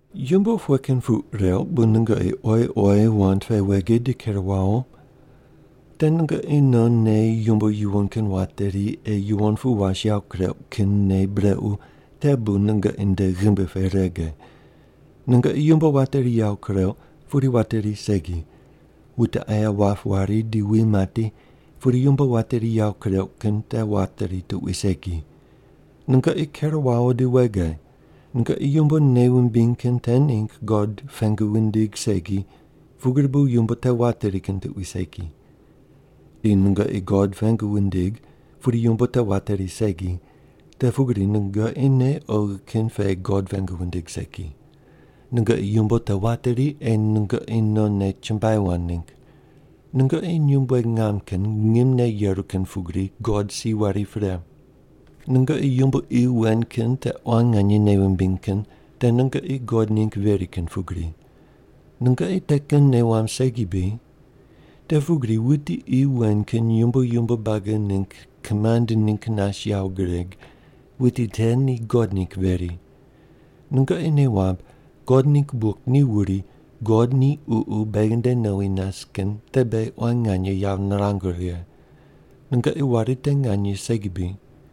Yumbo pughe kin puq reuq bu nungoqi oyi oyi wand pe wege di ker wawo? Te nungoqi non nei yumbo yuwon kin wateri ei yuwon pu was yawo kureuq kin nei brequ te bu nungoqi nde ghimbi pe rege. Nungoqi yumbo wateri yawo kureuq, pudi wateri segi. Wute aye wap wari di wi mati, pudi yumbo wateri yawo kureuq kin te wateri tuqui segi. Nungoqi ker wawo di wege. Nungoqi yumbo nei wumbiny kin te ningg God pengu windig segi, pugri bu yumbo te wateri kin tuqui segi. Di nungoqi God pengu wundig pudi yumbo te wateri segi, te pugri nungoqi nei oghi kin pe God pengu wundig segi. Nungoqi yumbo te wateri ei nungoqi nonne chumbuai wand ningg. Nungoqi nyumbueg ngam kin ngimne yeru kin pugri God si weri pre. Nungoqi yumbo qi wen kin te quan nganye nei wumbiny kin te nungoqi God ningg veri kin pugri. Nungoqi te kin nei wamb segi bri? Te pugri wuti qi wen kin yumbo yumbo buagi ningg kimand ningg nas yawo gureg, wuti te ni God ningg veri. Nungoqi nei wamb God ningg buk ni wuri, “God ni Ququ beghi nde nowi nas kin te beghi quan nganye yawo nirangu righe.” Nungoqi wari te nganye segi bri?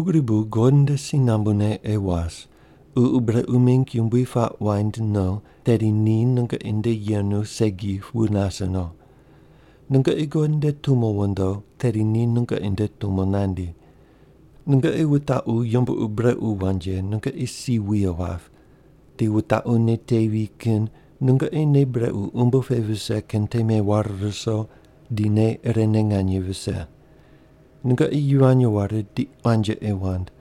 Pugri bu God nde si nambune ei was. Ququ brequ mingg yumbui puaq waind no, tedi ni nungoqi nde yenu segi wu nase no. Nungoqi God nde tumo wondo tedi ni nungoqi nde tumo nandi. Nungoqi wutaqu yumbo ur brequ wand ye, nungoqi si wuye wap. Di wutaqu nei tevi kin nungoqi nei brequ umbo pe vise kin te meware ruso di nei irene nganye vise. Nungoqi yivany ware di quanji ei wand.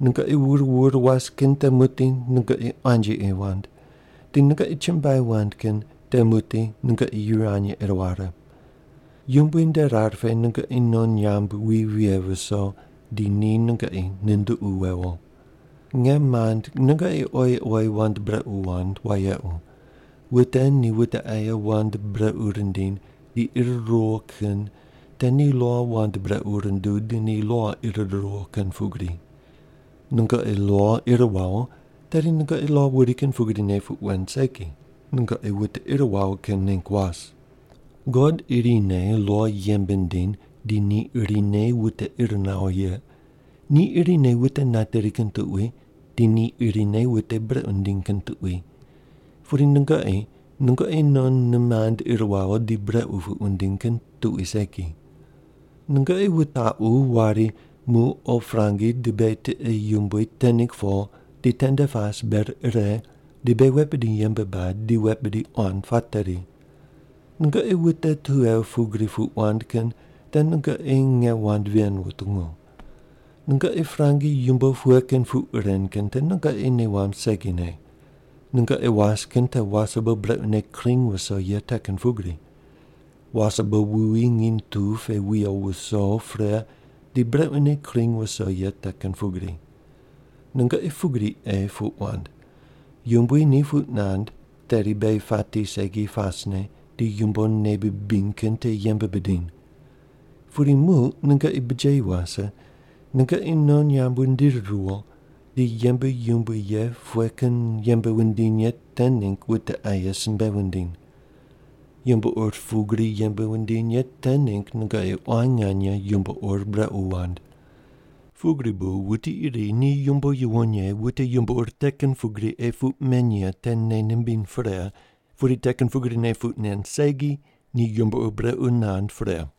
Nungoqi wur wur was kin te muqdi nungoqi quanji ei wand, di nungoqi chumbuai wand kin te muqdi nungoqi yivany ei ware. Yumbui nde rar pe nungoqi non nyamb wi vighe viso di ni nungoqi nunduqu wewo. Nge mand nungoqi oyi oyi wand brequ wand wayequ. Wute ni wute aye wand brequ rindiny di ir ruwo kin te ni lo wand brequ runduw di ni lo ir ruwo kin pugri. Nungoqi lo ir wawo, tedi nungoqi lo wuri kin pugrine puq wen segi, nungoqi wute ir wawo kin ningg was. God irine lo yembe nindiny di ni irine wute ir nawo ye. Ni irine wute nateri kin tuqui, di ni irine wute brequ nindiny kin tuqui. Pudi nungoqi, nungoqi non nimand ir wawo di brequ puq wundiny kin tuqui segi. Nungoqi wutaqu wari, “Muq o prangi di beghi tiqe yumbui te ningg po di tende pas ber ire di beghi wet bidi yembe bad, di wet bidi quan pateri.” Nungoqi wute tughe pugri puq wand kin te nungoqi nge wand ven wutungu. Nungoqi prangi yumbo pughe kin puq ren kin te nungoqi nei wamb segine. Nungoqi was kin te wasebo brequne kring wuso ye te kin pugri. Wasebo wuwi nginy tu pe wuyo wuso pre di brequne kring wuso ye te kin pugri. Nungoqi pugri ei puq wand, “Yumbui ni puq nand tedi beghi pati segi pasne di yumbo nei bibiny kin te yembe bidiny.” Pudi muq nungoqi bijeyi wase, nungoqi non nyamb wundiri riwo di yembe yumbui ye pughe kin yembe wundiny ye te ningg wute aye simbe wundiny. Yumbo ur pugri yembe wundiny ye te ningg nungoqi quan nganye yumbo ur brequ wand. Pugri bu wuti iri ni yumbo yuwon ye wute yumbo ur te kin pugri ei puq men ye te nei nimbiny pre, pudi te kin pugrine puq nen segi, ni yumbo ur brequ nand pre.